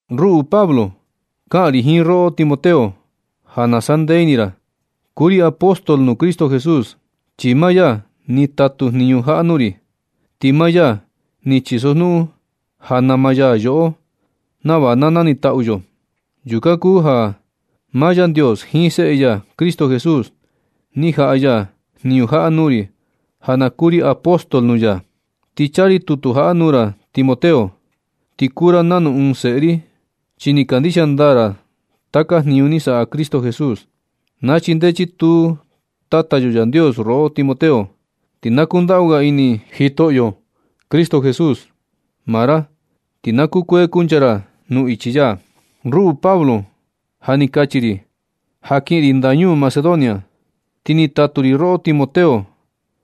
Ruꞌu Pablo, kaꞌan ri jiin roꞌo Timoteo, ja na sandee ini ra. Kuu ri apóstol nuu Cristo Jesús, chi maa ya ni tatu jniñu jaꞌa nuu ri. Ti maa ya ni chisojnuꞌun ja nama ya yoꞌo nava na nanitaꞌu yo. Yukan kuu ja maa Yandios jiin Seꞌe ya Cristo Jesús ni jaꞌa ya jniñu jaꞌa nuu ri ja na kuu ri ɨɨn apóstol nuu ya. Ti chaa ri tutu jaꞌa nuu ra Timoteo, ti kuu ra nanu ɨɨn seꞌe ri, chi ni kandixia ndaa ra taka jniñu ni saꞌa Cristo Jesús. Na chindee chituu Tata yo Yandios roꞌo Timoteo, ti na kundaꞌu ga ini Jitoꞌo Cristo Jesús maa ra. Ti na kukuee kuncha ra nuu ichi ya. Ruꞌu Pablo, ja ni kachi ri ja kiꞌin ri ndañuu Macedonia, ti ni tatu ri roꞌo Timoteo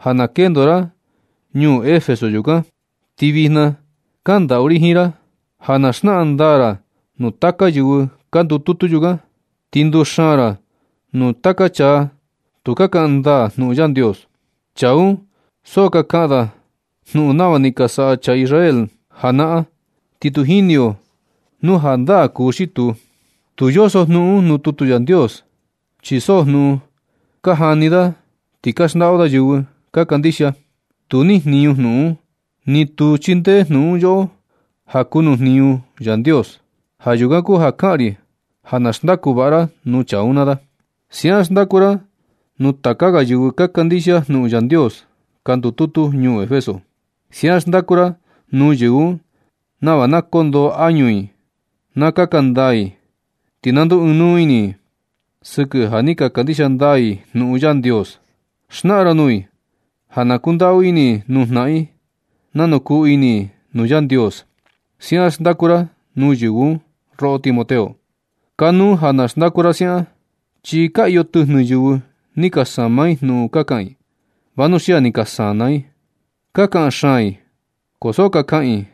ja na kendo ra ñuu Efeso yukan. Ti vijna kandaꞌu ri jiin ra ja na xnaꞌan ndaa ra nuu taka yɨvɨ ka ndututu yukan. Ti nduxaan ra nuu taka chaa tu ka kaꞌan ndaa jnuꞌun Yandios. Chaa un so ka kaꞌan da jnuꞌun nava ni ka saꞌa chaa Israel janaꞌan, ti tu jini yo nu jandaa kuu xi tuu. Tu yoso jnuꞌun un nuu tutu Yandios, chi so jnuꞌun ka jani da ti ka xndaꞌu da yɨvɨ ka kandixia. Tu nijniñu jnuꞌun un, ni tu chindee jnuꞌun un yoꞌo ja kuu nuu jniñu Yandios. Ja yukan kuu ja kaꞌan ri ja na xndaku vaꞌa ra nuu chaa un naa da. Siaꞌan xndaku ra nuu taka ga yɨvɨ ka kandixia jnuꞌun Yandios ka ndututu ñuu Efeso. Siaꞌan xndaku ra nuu yɨvɨ un nava na kondoo añu i na kaꞌan ndaa i, ti na nduu ɨɨn nuu ini i sɨkɨ ja ni ka kandixia ndaa i jnuꞌun Yandios. Xnaꞌan ra nuu i ja na kundaꞌu ini nuu jnaꞌan i nanu kuu ini i nuu Yandios. Siaꞌan xndaku ra nuu yɨvɨ un, roꞌo Timoteo. Kanuu ja na xndaku ra siaꞌan, chi ka iyo tɨjnɨ yɨvɨ ni ka sama i jnuꞌun ka kaꞌan i, vanuxia ni ka sana ini i. Ka kaꞌan xaan i ko so ka kaꞌan i,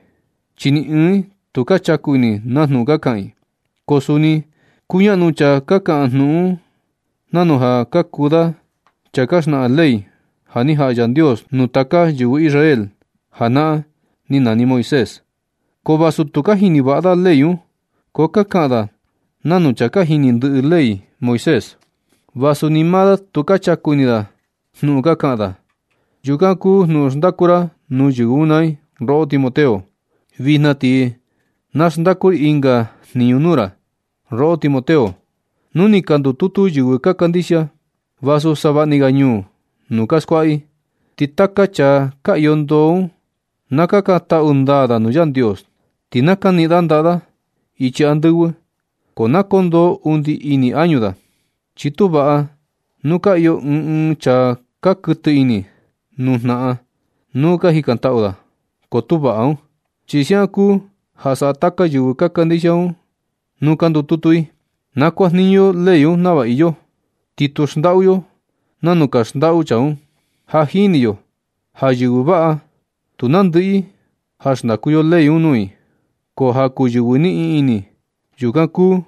chi ni ɨɨn i tu ka chaku ini na jnuꞌun ka kaꞌan i. Ka kuni kuñaꞌnu chaa ka kaꞌan jnuꞌun un nanu ja ka kuu da chaa ja ka xnaꞌan ley ja ni jaꞌa Yandios nuu tata yɨvɨ Israel janaꞌan ni nani Moisés. Ko vasu tu ka jini vaꞌa da ley un, ko ka kaꞌan da nanu chaa ka jini ndɨꞌɨ ley Moisés, vasu ni maa da tu ka chaku ini da na jnuꞌun ka kaꞌan da. Yukan kuu jnuꞌun xndaku ra nuu yɨvɨ un naa i, roꞌo Timoteo. Vijna ti na xndaku ri ɨnga jniñu nuu ra, roꞌo Timoteo. Nu ni ka ndututu yɨvɨ ka kandixia, vasu savaꞌni ga ñuu nuu ka skuaꞌa i. Ti taka chaa ka iyo ndoo un, na kakantaꞌu ndaa da nuu Yandios. Ti na kaniꞌin da ndaꞌa da ichi andɨvɨ, ko na kondoo undi ini añu da. Chi tu vaꞌa nu ka iyo ɨɨn ɨɨn chaa ka kuɨtɨ ini nuu jnaꞌan nuu ka jikantaꞌu da, ko tu vaꞌa un. Ti siaꞌan kuu ja saꞌa taka yɨvɨ ka kandixia un nuu ka ndututu i. Na kuajniñu yo ley un nava iyo, ti tu xndaꞌu yo nanu ka xndaꞌu chaa un. Ja jini yo ja yɨvɨ vaꞌa tu nandɨꞌɨ i ja xndaku yo ley un nuu i, ko ja kuu yɨvɨ niꞌin ini, yukan kuu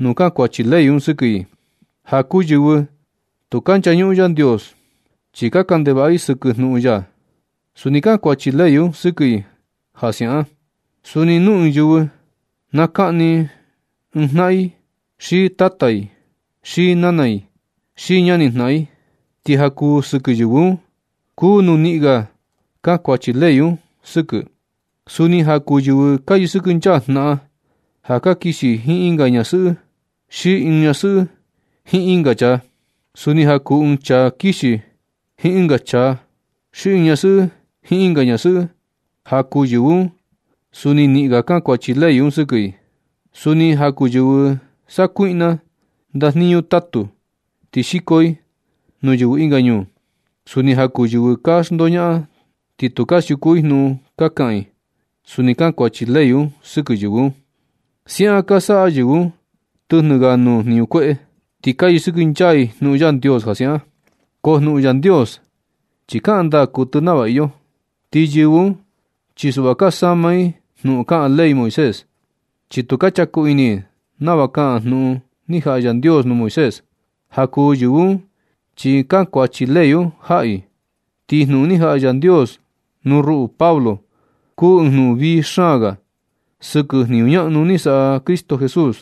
nuu kankuachi ley un sɨkɨ i. Ja kuu yɨvɨ tu ka nchañuꞌun Yandios, ti ka kaꞌan ndevaꞌa i sɨkɨ jnuꞌun ya. Suni kankuachi ley un sɨkɨ i ja siaꞌan. Suni nu ɨɨn yɨvɨ na kaꞌni i jnaꞌan i xi tata i xi nana i xi ñani jnaꞌan i. Ti ja kuu sɨkɨ yɨvɨ un, kuu nuu niꞌin ga kankuachi ley un sɨkɨ. Suni ja kuu yɨvɨ ka yɨkɨnchaa jnaꞌan ja ka kixi i jiin ɨnga ñasɨꞌɨ, xi ɨɨn ñasɨꞌɨ jiin ɨnga chaa. Suni ja kuu ɨɨn chaa kixi jiin ɨnga chaa, xi ɨɨn ñasɨꞌɨ jiin ɨnga ñasɨꞌɨ, ja kuu yɨvɨ un suni niꞌin ga kankuachi ley un sɨkɨ i. Suni ja kuu yɨvɨ sakuiꞌna ndajniñu tatu ti xiko i nuu yɨvɨ ɨnga ñuu. Suni ja kuu yɨvɨ ka xndoñaꞌan ti tu ka siuku i jnuꞌun ka kaꞌan i. Suni kankuachi ley un sɨkɨ yɨvɨ un. Siaꞌan ka saꞌa yɨvɨ un tɨjnɨ ga nuu jniñu kueꞌe, ti ka yɨsɨkɨnchaa i jnuꞌun Yandios ja siaꞌan. Ko jnuꞌun Yandios chi kaꞌan ndaa kuɨtɨ nava iyo, ti yɨvɨ un, chi suꞌva ka sama i jnuꞌun kaꞌan ley Moisés. Chi tu ka chaku ini i nava kaꞌan jnuꞌun ni jaꞌa Yandios nuu Moisés. Ja kuu yɨvɨ un chi kankuachi ley un jaꞌa i. Ti jnuꞌun ni jaꞌa Yandios nuu ruꞌu Pablo kuu ɨɨn jnuꞌun vii xaan ga sɨkɨ jniñu ñaꞌnu ni saꞌa Cristo Jesús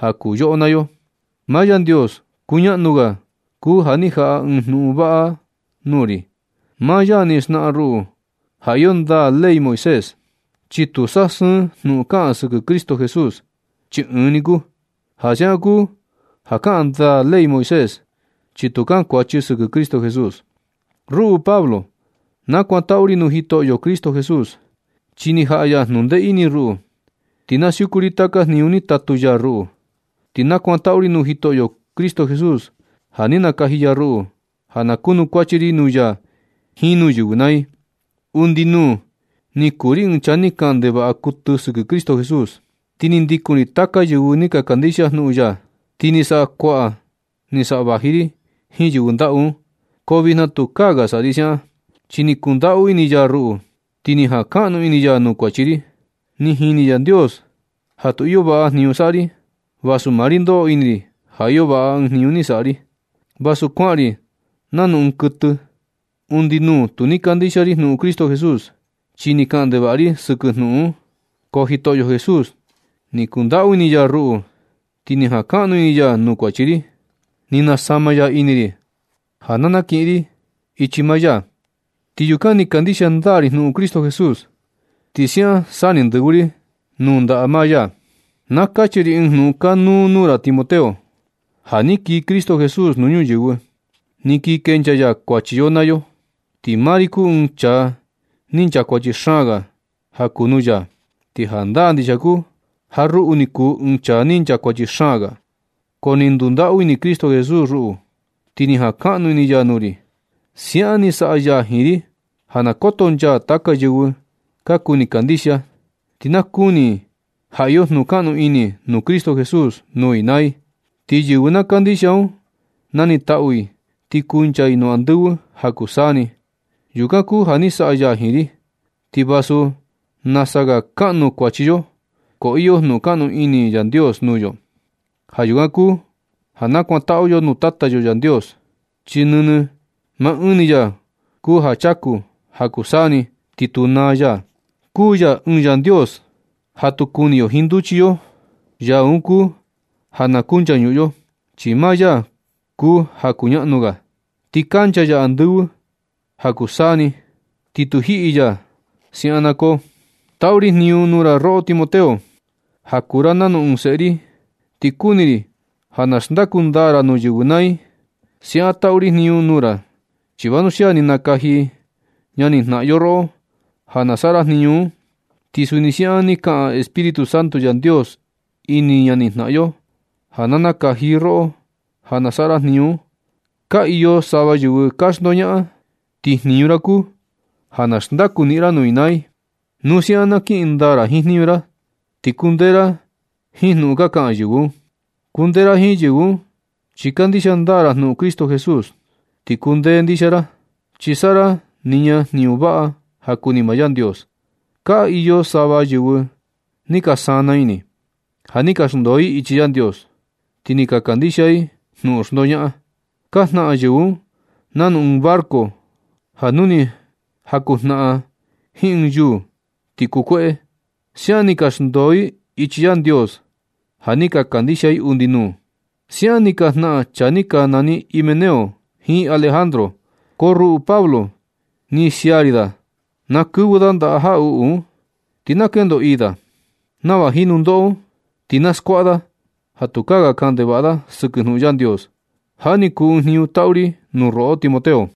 ja kuu yoꞌo naa yo. Maa Yandios kuñaꞌnu ga kuu ja ni jaꞌa ɨɨn jnuꞌun vaꞌa un nuu ri. Maa ya ni xnaꞌan ruꞌu ja iyo ndaa ley Moisés, chi tu saꞌa sɨɨn jnuꞌun kaꞌan sɨkɨ Cristo Jesús, chi ɨɨn ni kuu. Ja siaꞌan kuu ja kaꞌan ndaa ley Moisés, chi tu kankuachi sɨkɨ Cristo Jesús. Ruꞌu Pablo, nakuantaꞌu ri nuu Jitoꞌo Cristo Jesús, chi ni jaꞌa ya jnundee ini ruꞌu, ti na siuku ri taka jniñu ni tatu ya ruꞌu. Ti nakuantaꞌu ri nuu Jitoꞌo Cristo Jesús ja ni nakaji ya ruꞌu ja na kunukuachi ri nuu ya jiin nuu yɨvɨ naa i. Undi nuu ni kuu ri ɨɨn chaa ni kaꞌan ndevaꞌa kuɨtɨ sɨkɨ Cristo Jesús. Ti ni ndikun ri taka yɨvɨ ni ka kandixia jnuꞌun ya, ti ni saꞌa kuaꞌan ni saꞌa vaji ri jiin yɨvɨ ndaꞌu un. Ko vijna tukaa ga saꞌa ri siaꞌan, chi ni kundaꞌu ini ya ruꞌu, ti ni jankaꞌnu ini ya nuu kuachi ri. Ni jini Yandios ja tu iyo vaꞌa jniñu saꞌa ri, vasu maa ri ndoꞌo ini ri ja iyo vaꞌa ɨɨn jniñu ni saꞌa ri, vasu kuaꞌan ri nanu ɨɨn kuɨtɨ. Undi nuu tu ni kandixia ri jnuꞌun Cristo Jesús, chi ni kaꞌan ndevaꞌa ri sɨkɨ jnuꞌun un. Ko Jitoꞌo Jesús, ni kundaꞌu ini ya ruꞌu, ti ni jankaꞌnu ini ya nuu kuachi ri. Ni nasama ya ini ri ja na nakiꞌin ri ichi maa ya, ti yukan ni kandixia ndaa ri jnuꞌun Cristo Jesús. Ti siaꞌan sa ni ndɨvɨ ri nuu ndaꞌa maa ya. Na kachi ri ɨɨn jnuꞌun kanuu nuu ra Timoteo. Ja ni kii Cristo Jesús nuu ñuyɨvɨ, ni kii kenchaa ya kuachi yo naa yo, ti maa ri kuu ɨɨn chaa ni nchakuachi xaan ga ja kuu nuu ya. Ti jandaa ndixia kuu ja ruꞌu ni kuu ɨɨn chaa ni nchakuachi xaan ga, ko ni ndundaꞌu ini Cristo Jesús ruꞌu, ti ni jankaꞌnu ini ya nuu ri. Siaꞌan ni saꞌa ya jiin ri ja na kotonchaa taka yɨvɨ ka kuni kandixia, ti na kuni i ja iyo jnukaꞌnu ini nuu Cristo Jesús nuu i naa i. Ti yɨvɨ na kandixia un, nanitaꞌu i ti kuncha i nuu andɨvɨ ja kuu saa ni. Yukan kuu ja ni saꞌa ya jiin ri. Ti vasu nasa ga kaꞌnu kuachi yo, ko iyo jnuꞌun kaꞌnu ini Yandios nuu yo. Ja yukan kuu ja na kakantaꞌu yo nuu Tata yo Yandios, chi nɨnɨ maa ɨɨn ni ya kuu ja chaku ja kuu saa ni ti tu naa ya. Kuu ya ɨɨn Yandios ja tu kuni yo jiin nduchi yo, Yaa un kuu ja na kunchañuꞌun yo, chi maa ya kuu ja kuñaꞌnu ga. Ti kancha ya andɨvɨ ja kuu tiempu, ti tu jiꞌi ya. Siaꞌan na koo. Taꞌu ri jniñu nuu ra roꞌo Timoteo, ja kuu ra nanu ɨɨn seꞌe ri. Ti kuni ri ja na xndaku ndaa ra nuu yɨvɨ naa i. Siaꞌan taꞌu ri jniñu nuu ra, chi vanuxia ni ka nakaji ñani jnaꞌan yo roꞌo ja na saꞌa ra jniñu un. Ti suni siaꞌan ni kaꞌan Espíritu Santo Yandios ini ñani jnaꞌan yo ja na nakaji i roꞌo ja na saꞌa ra jniñu un. Ka iyo sava yɨvɨ ka xndoñaꞌan, ti jniñu ra kuu ja na xndaku niꞌin ra nuu i naa i. Nu siaꞌan na kiꞌin ndaa ra jiin jniñu ra, ti kundee ra jiin jnuꞌun ka kaꞌan yɨvɨ un. Kundee ra jiin yɨvɨ un chi kandixia ndaa ra jnuꞌun Cristo Jesús, ti kundee ndixia ra, chi saꞌa ra niña jniñu vaꞌa ja kuni maa Yandios. Ka iyo sava yɨvɨ ni ka sana ini, ja ni ka xndoo i ichi Yandios, ti ni ka kandixia i jnuꞌun xndoñaꞌan. Ka jnaꞌan yɨvɨ un nanu ɨɨn barco ja nu ni jakunjnaꞌan jiin ɨɨn yuu ti kukueꞌe. Siaꞌan ni ka xndoo i ichi Yandios ja ni ka kandixia i undi nuu. Siaꞌan ni ka jnaꞌan chaa ni ka nani Himeneo jiin Alejandro. Ko ruꞌu Pablo, ni sia ri da ja na kɨvɨ da ndaꞌa jaꞌuꞌu un, ti na kendo ii da, nava jiin nundoꞌo un ti na skuaꞌa da ja tukaa ga kaꞌan ndevaꞌa da sɨkɨ jnuꞌun Yandios. Jaꞌa ni kuu ɨɨn jniñu taꞌu ri nuu roꞌo Timoteo.